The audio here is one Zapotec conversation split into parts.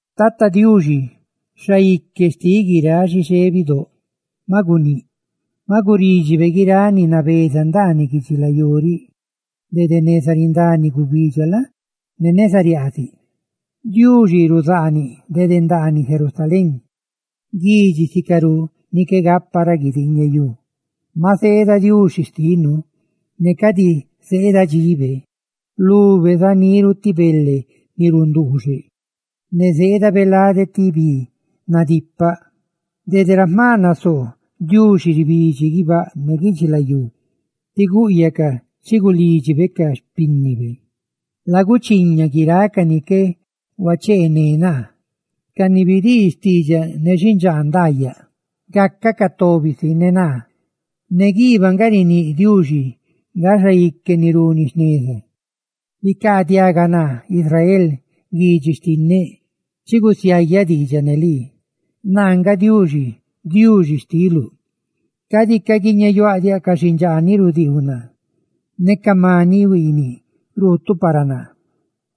Tata Diuxi, Diuxi xtiꞌ guiráꞌ xixé bidóꞌ, maꞌ guníꞌ; maꞌ gurídxibe guiráꞌ ni nabeza ndaaniꞌ guidxilayú riꞌ dede neza rindani gubidxa la? ne neza riaaziꞌ. Diuxi ruzaaniꞌ dede ndaaniꞌ Sión, guidxi sicarú ni qué gapa ra guidiiñeyú. Maꞌ zeeda Diuxi xtinu ne cadi zeeda dxibe; lube zá niru ti bele ni runduuxeꞌ; ne zeedabe lade ti bi nadipaꞌ. Dede ra jma nasoo, Diuxi ribidxi guibáꞌ ne guidxilayú ti gúꞌyacaꞌ chi gulídxibe ca xpínnibe: «Laguchiña guiráꞌ ca ni qué huacheené naa, ca ni bidii xtiidxaꞌ ne xindxaa ndaayaꞌa gácacaꞌ tobi si ne naa.» Ne guibáꞌ nga riníꞌ Diuxi nga xaique ni runi jneza. «Bicaadiaga naa Israel, Guidxi xtinneꞌ; chi gusiayaꞌ xtiidxaꞌ ne lii. ¡Naa nga Diuxi! ¡Diuxi xtiluꞌ! Cadi caguiñeyuáꞌ diaꞌ ca xindxaa ni rudiiu naa ne ca maniꞌ ni ruutuꞌ para naa.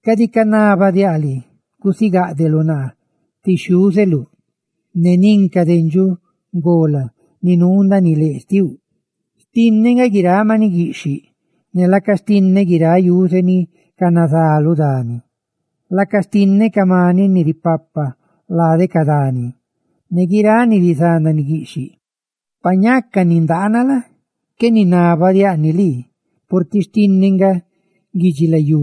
Cadi canabaꞌ diaꞌ lii gusigáꞌdeluꞌ naa ti xhiúzeluꞌ ne nin ca dendxuꞌ ngolab ni nuu ndaaniꞌ leꞌ xtiluꞌ; xtinneꞌ nga guiráꞌ maniꞌ guiꞌxhiꞌ, ne laaca xtinneꞌ guiráꞌ yuze ni canazá lu dani; laaca xtinneꞌ ca maniꞌ ni ripapa lade ca dani ne guiráꞌ ni rizá ndaaniꞌ guiꞌxhiꞌ. Pa ñaca nindaana la? qué ninabadiáꞌ ni lii, purtiꞌ xtinneꞌ nga guidxilayú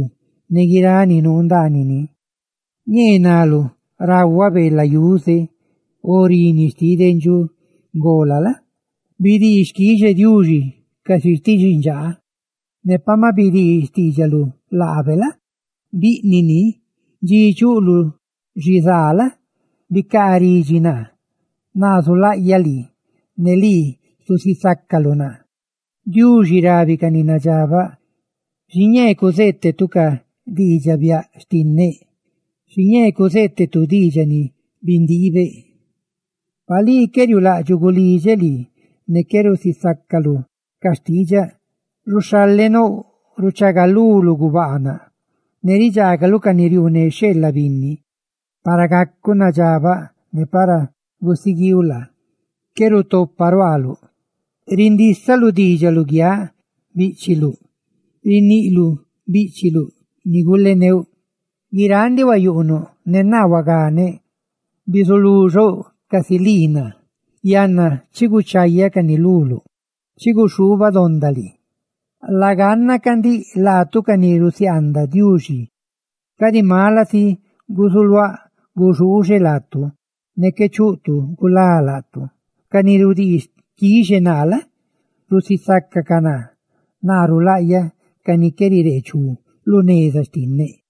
ne guiráꞌ ni nuu ndaanini. Ñee naluꞌ rahuaꞌ beela yuze, o reeꞌ rini xtiꞌ dendxuꞌ ngola la? ¡Bidii xquixe Diuxi casi ti xindxaa; ne pa maꞌ bidii xtiidxaluꞌ laabe la? biꞌniꞌ ni! Dxi chuꞌluꞌ xizaa la? bicaa ridxi naa; naa zulaꞌyaꞌ lii, ne lii zusisácaluꞌ naa.» Diuxi rabi ca ni nadxabaꞌ: «Xiñee cuzeetuꞌ ca diidxaꞌ biaꞌ xtinneꞌ, xiñee cuzeetuꞌ diidxaꞌ ni bindiibeꞌ, pa lii qué riuulaꞌdxuꞌ gulidxeꞌ lii ne qué rusisácaluꞌ ca xtiidxaꞌ. Ruxhalenouꞌ ruchagaluluꞌ gubaanaꞌ; ¡ne ridxaagaluꞌ ca ni riuune xheela binni! Para gacuꞌ nadxabaꞌ ne para gusiguiiu la? qué rutopa ruaaluꞌ. Rindísaluꞌ diidxaꞌ luguiáꞌ bíꞌchiluꞌ; ¡riniꞌluꞌ bíꞌchiluꞌ ni guleneuꞌ! Guiráꞌ ndiꞌ huayuꞌnuꞌ, ne naa huaganeꞌ; bizulú xouꞌ casi lii naa. Yanna chi guchayáꞌ cani luluꞌ, ¡chi guxhubadondaꞌ lii! »Laganna chaahuiꞌ ca ndiꞌ, laatu ca ni rusiaandaꞌ Diuxi, cadi mala si gusuluáꞌ guxuuxe laatu, ne qué chuꞌ tu gulá laatu. Ca ni rudii xquixe naa la? rusisacaꞌ naa. ¡Naa rulaꞌyaꞌ ca ni qué rireechú lu neza xtinneꞌ!»